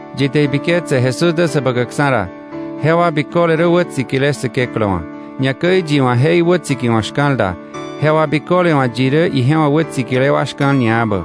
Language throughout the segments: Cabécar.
Yi te ibiketse Jesús dä Säbäkäkksa̱ ra, jewa biköle rä wätsikile Säkeklä wa̱. Ñakäi yi wa̱ je iwätsikiwa̱k shka̱l da, jewa biköle wa̱ yi rä ije wa̱ wätsikile wa shka̱l ñaebä.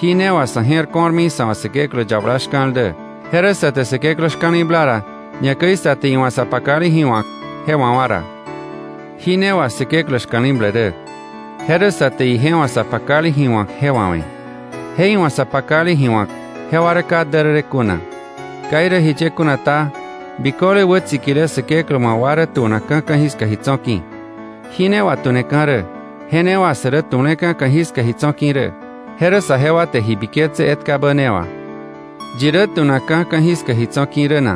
Jí ne wà sa̱ je̱r ko̱rmi sa̱ wa̱ Säkeklä yabala shka̱l dä: Je rä sa te Säkeklä shka̱li̱bla ra, ñakäi sa te iwa̱ sa pakale ji wa̱k, je wawa̱ ra. Jí ne wà Säkeklä shka̱li̱ble rä: Je rä sa te ije wa̱ sa pakale ji wa̱k je wawe̱. Je iwa̱ sa pakale ji wa̱k, jewa rä ka därërë kuna. Ka irä jiye kuna ta, biköle wätsikile Säkeklä wa̱ wa rä tu̱nakka̱ ka̱jiska ji tso̱ ki̱. Jí ne wà tu̱neka̱ rä, je ne wà sä rä tu̱le̱ka̱ ka̱jiska ji tso̱ ki̱ rä: je rä saje wa te ji biketse etkabä ne wà. ¿Yi rä tu̱nakka̱ ka̱jiska ji tso̱ ki̱ rä na?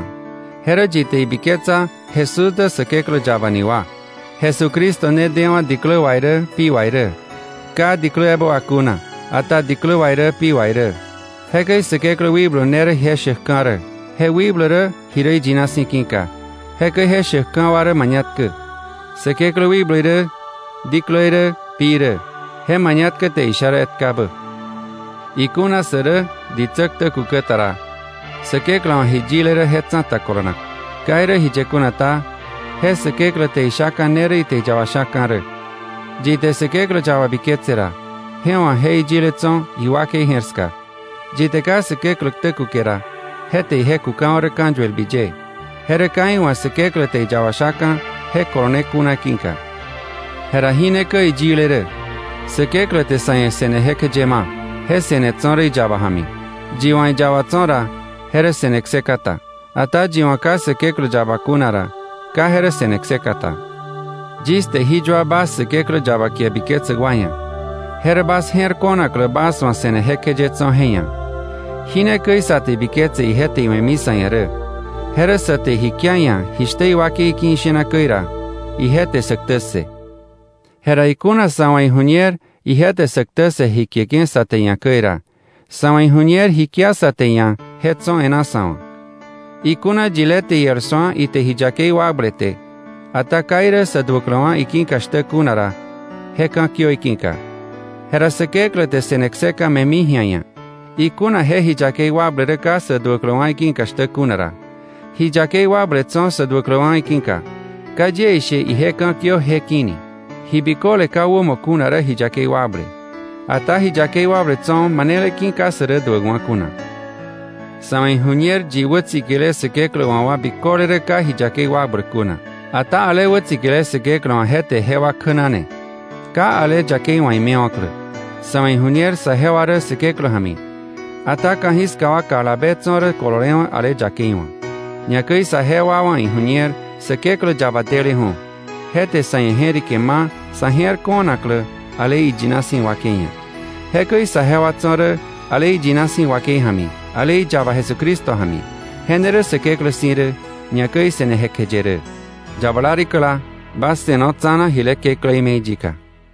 Je rä yi te ibiketsa Jesús dä Säkeklä yaba ni wa. Jesucristo ne dewa̱ diklä wà irä pi wà irä, ka diklä ebä wà kuna, ata diklä wà irä pi wà irä. Jekäi Säkeklä wikblu ne rä je shäkka̱ rä, je wikblu rä ji rä iyina si̱ ki̱ka. Jekäi je shäkka̱ wa rä mañatkä: Säkeklä Wikblu irä, diklä irä, pi irä. Je mañatkä te isha rä etkabä. Ikuna sä rä ditsä ktä kukä ta ra, Säkeklä wa̱ ji yile rä je tsa̱ta kolonak. Ka irä jiye kuna ta, je Säkeklä te ishaka̱ ne rä ite iyaba shaka̱ rä. Yi te Säkeklä yaba biketse ra, je wa̱ je iyile tso̱ iwakei je̱r ska. Yi te ka Säkeklä ktä kuke ra, je te ije kukawa̱ rä ka̱yuelbi ye, je rä ka iwa̱ Säkeklä te iyaba shaka̱, je kolone kuna ki̱ka. Jera jí ne käi iyile rä: Säkeklä te sa̱ ia̱ se̱ne jekjeye ma; je se̱ne tso̱ rä iyaba ja̱mi. Yi wa̱ iyaba tso̱ ra, je rä se̱ne kseka ta. Ata yi wa̱ ka Säkeklä yaba kuna ra, ka je rä se̱ne kseka ta. Yis te jí yua bas Säkeklä yaba kie biketsäk wa ia̱, je rä bas je̱r ko̱naklä bas wa̱ se̱ne jekjeye tso̱ je ia̱. Jí ne käi sa te ibiketse ije te iwe̱mi sa̱ ia̱ rä: Je rä sä te ji kia iia̱ jishtä iwakei ki̱ ishena käi ra, ije te sä ktä ssë. Jera ikuna sa̱ wa̱ iju̱ñer ije te sä ktä ssë ji kieke̱ sa te iia̱ käi ra, sa̱ wa̱ iju̱ñer ji kia sa te iia̱ je tso̱ e̱ná sa̱ wa̱. Ikuna yilé te iel su̱a ite ji yakei wakblete, ata ka irä sä duäkläwa̱ iki̱ka shtä kuna ra, je ka̱kiö iki̱ka. Je ra Säkeklä te se̱ne kseka me̱mi ji̱a iia̱, ikuna je ji yakei wakble rä ka sä duäkläwa̱ iki̱ka shtä kuna ra. Ji yakei wakble tso̱ sä duäkläwa̱ iki̱ka; ka yie ishe ije ka̱kiö je ki̱ ni. Ji biköle ka wämo kuna rä ji yakei wakble, ata ji yakei wakble tso̱ manele ki̱ka ka sä rä duäkwa̱ kuna. Sa̱ wa̱ iju̱ñer yi wätsikile Säkeklä wa̱ wa biköle rä ka ji yakei wakbläk kuna. Ata ale wätsikile Säkeklä wa̱ je te jewa kjänane, ka ale yakei wa̱ imewa̱klä. Sa̱ wa̱ iju̱ñer saje wa rä Säkeklä ja̱mi, ata ka̱jiska wa kalabe tso̱ rä kololewa̱ ale yakei wa̱. Ñakäi saje wa wa̱ iju̱ñer Säkeklä yaba deleju̱, je te sa̱ ia̱ je̱rike ma sa̱ je̱r ko̱naklä ale iyina si̱ wakei ia̱. Jekäi saje wa tso̱ rä ale iyina si̱ wakei ja̱mi, ale iyaba Jesucristo ja̱mi. Je ne rä Säkeklä si̱ rä, ñakäi se̱ne jekjeye rä. Yabala rikäla, bas se̱no tsa̱na jile kekläí me̱i yika.